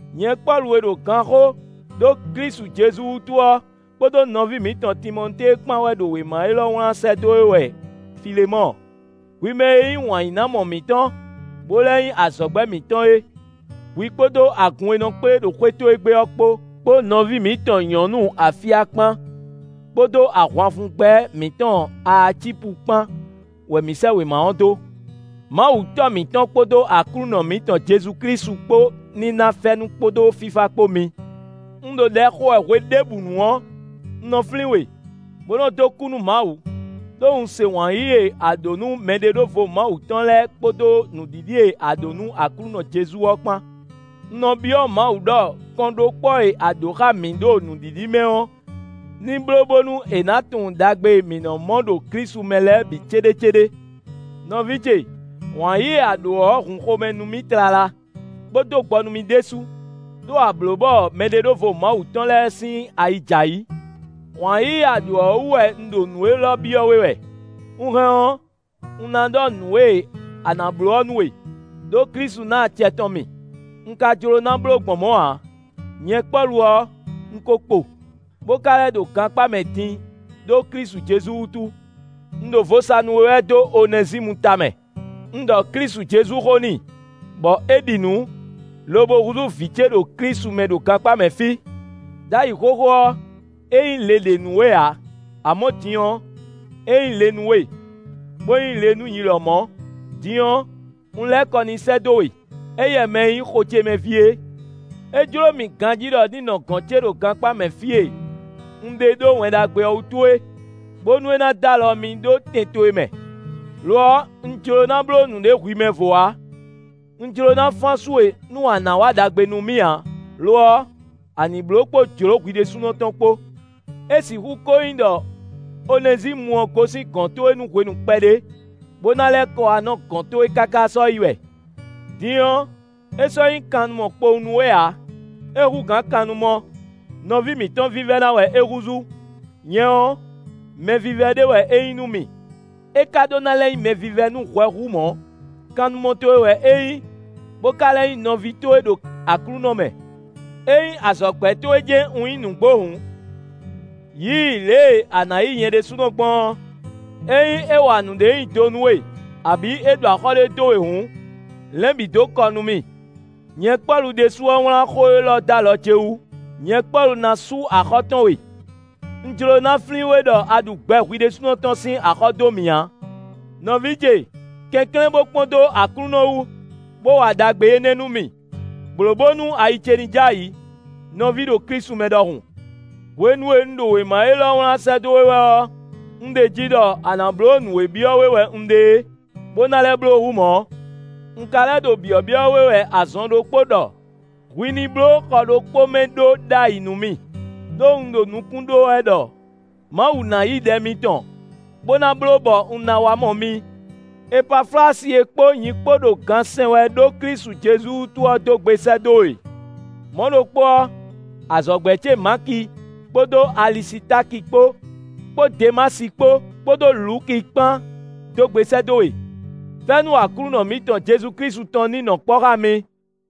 Nyɛ Pɔ́lu e ɖo ganxó ɖó Klísu Jezu wútu ɔ́, kpódó nɔví mǐtɔn Timɔtée kpán wɛ ɖo wěma élɔ́ wlán sɛ́ dó we wɛ Filemɔ́ɔ, hwi mɛ e nyí wǎnyínámɔ mǐtɔn, bó lɛ́ nyí azɔ̌gbɛ́ mǐtɔn é. Hwi kpódó agun e nɔ kplé ɖo xwé towe gbe ɔ́ kpó, kpó nɔví mǐtɔn nyɔ̌nu Afya kpán, kpódó ahwanfungbɛ́ mǐtɔn Aacípu kpán wɛ mǐ sɛ́ wěma ɔ́ dó. Mawu Tɔ́ mǐtɔn kpódó Aklúnɔ mǐtɔn Jezu Klísu kpó ní ná fɛ́nú kpódó fífá kpó mi. Un ɖo ɖɛ xo wɛ hweɖěbǔnu ɔ́, un nɔ flín we, bó nɔ dó kú nú Mawu, ɖó un se wǎn yíyí e a ɖǒ nú mɛɖeɖóvo Mawu tɔn lɛ́ɛ kpódó nǔɖiɖi e a ɖǒ nú Aklúnɔ Jezu ɔ́ kpán. Un nɔ byɔ́ Mawu ɖɔ kɔnɖókpɔ́ e a ɖǒ xá mǐ ɖo nǔɖiɖi mɛ ɔ́ ní bló bónú è nǎ tunwun ɖagbe e mǐ nɔ mɔ ɖo Klísu mɛ lɛ́ɛ bǐ céɖécéɖé. Nɔví ce, wǎn yíyí e a ɖǒ ɔ́ hun xomɛ nú mì tlala, bó dó gbɔ nú mì ɖésú, ɖó a blǒ bɔ mɛɖeɖóvo Mawu tɔn lɛ́ɛ sín ayi jɛ ayǐ. Wǎn yíyí e a ɖǒ ɔ́ wú wɛ un ɖo nǔ élɔ́ byɔ́ we wɛ. Un hɛn ɔ́, un ná ɖɔ nǔ e a nǎ bló ɔ́ nú we, ɖó Klísu ná acɛ tɔn mì; un ka jló ná bló gbɔn mɔ̌ ǎ. Nyɛ Pɔ́lu ɔ́, un ko kpo, bó ka lɛ́ ɖo gankpá mɛ din ɖó Klísu Jezu wútu. Un ɖo vo sa nú we wɛ dó Onɛzímu tamɛ. Un ɖɔ Klísu Jezu xó n'i, bɔ é ɖi nǔ, lobo húzú vǐ ce ɖo Klísu mɛ ɖo gankpá mɛ fí. Đ'ayǐ xóxó ɔ́, é nyí le ɖě nú we ǎ; amɔ̌ din ɔ́, é nyí le nú we, bó nyí le nú nyi lɔmɔ̌. Din ɔ́, un lɛ́ kɔ n'i sɛ́ dó we; éyɛ́ mɛ e nyí xo ce mɛ ví é. É jló mì ganjí ɖɔ ní nɔ gɔ̌n ce ɖo gankpá mɛ fí e un ɖe ɖó Wɛn Ɖagbe ɔ́ wútu é, bónú é ná dó alɔ mì ɖó tɛn towe mɛ. Lo ɔ́, un jló ná bló nǔɖé hwi mɛvo ǎ; un jló ná fán asú we nú a nǎ wa ɖagbe nú mì ǎ; lo ɔ́, a nǐ bló kpó jlǒ hwi ɖésúnɔ tɔn kpó. É sixú ko nyí ɖɔ Onɛzímu ɔ́ gosín gɔ̌n towe nú hwenu kpɛɖé, bó ná lɛ́ kɔ wá nɔ gɔ̌n towe káká sɔ́yi wɛ. Din ɔ́, é sɔ́ nyí kannumɔ kpowun nú we ǎ; é hú gǎn kannumɔ. Nɔví mǐtɔn vívɛ́ná wɛ é húzú. Nyɛ ɔ́, mɛvívɛ́ ɖé wɛ é nyí nú mì. É ka ɖó ná lɛ́ nyí mɛvívɛ́ nú hwɛ hú mɔ̌; kannumɔ towe wɛ é nyí, bó ka lɛ́ nyí nɔví towe ɖo Aklúnɔ mɛ. Ényí azɔ̌gbɛ́ towe jɛ́n un nyí nǔgbó hǔn, yí i lě e a nǎ yí nyɛ ɖésúnɔ gbɔn ɔ́. Ényí é wa nǔɖé nyi do nú we, abǐ é ɖu axɔ́ ɖé dó we hǔn, lɛ̌n bǐ dó kɔ nú mì. Nyɛ Pɔ́lu ɖésú wɛ wlán xó élɔ́ dó alɔ ce wú: nyɛ Pɔ́lu ná sú axɔ́ tɔn we; un jló ná flín we ɖɔ a ɖu gbɛ hwi ɖésúnɔ tɔn sín axɔ́ dó mì ǎ. Nɔví ce! Kɛnklɛ́n bó kpɔ́n dó Aklúnɔ wú, bó wa ɖagbe énɛ́ nú mì; blǒ bónú ayi ce ní j'ayǐ, nɔví ɖo Klísu mɛ ɖɔhun. Hwenu e un ɖo wěma élɔ́ wlán sɛ́ dó we wɛ ɔ́, un ɖeji ɖɔ a nǎ bló nǔ e byɔ́ we wɛ un ɖe é, bó ná lɛ́ bló hú mɔ̌. Un ka lɛ́ ɖo byɔ̌byɔ́ we wɛ azɔn ɖokpó ɖɔ hwi ní bló xɔ ɖokpó mɛ ɖó ɖ'ayǐ nú mì; ɖó un ɖo nukún ɖó wɛ ɖɔ Mawu ná yí ɖɛ mitɔn bó ná bló bɔ un ná wá mɔ mi. Epaflasi e kpó nyi kpó ɖo gan sɛn wɛ ɖó Klísu Jezu wútu ɔ́ dó gbe sɛ́ dó we. Mɔ̌ ɖokpó ɔ́, azɔ̌gbɛ́ ce Maki kpódó Alisitáki kpó, kpó Demási kpó, kpódó Luki kpán dó gbe sɛ́ dó we. Fɛ́nú Aklúnɔ mǐtɔn Jezu Klísu tɔn ní nɔ kpɔ́ xá mi.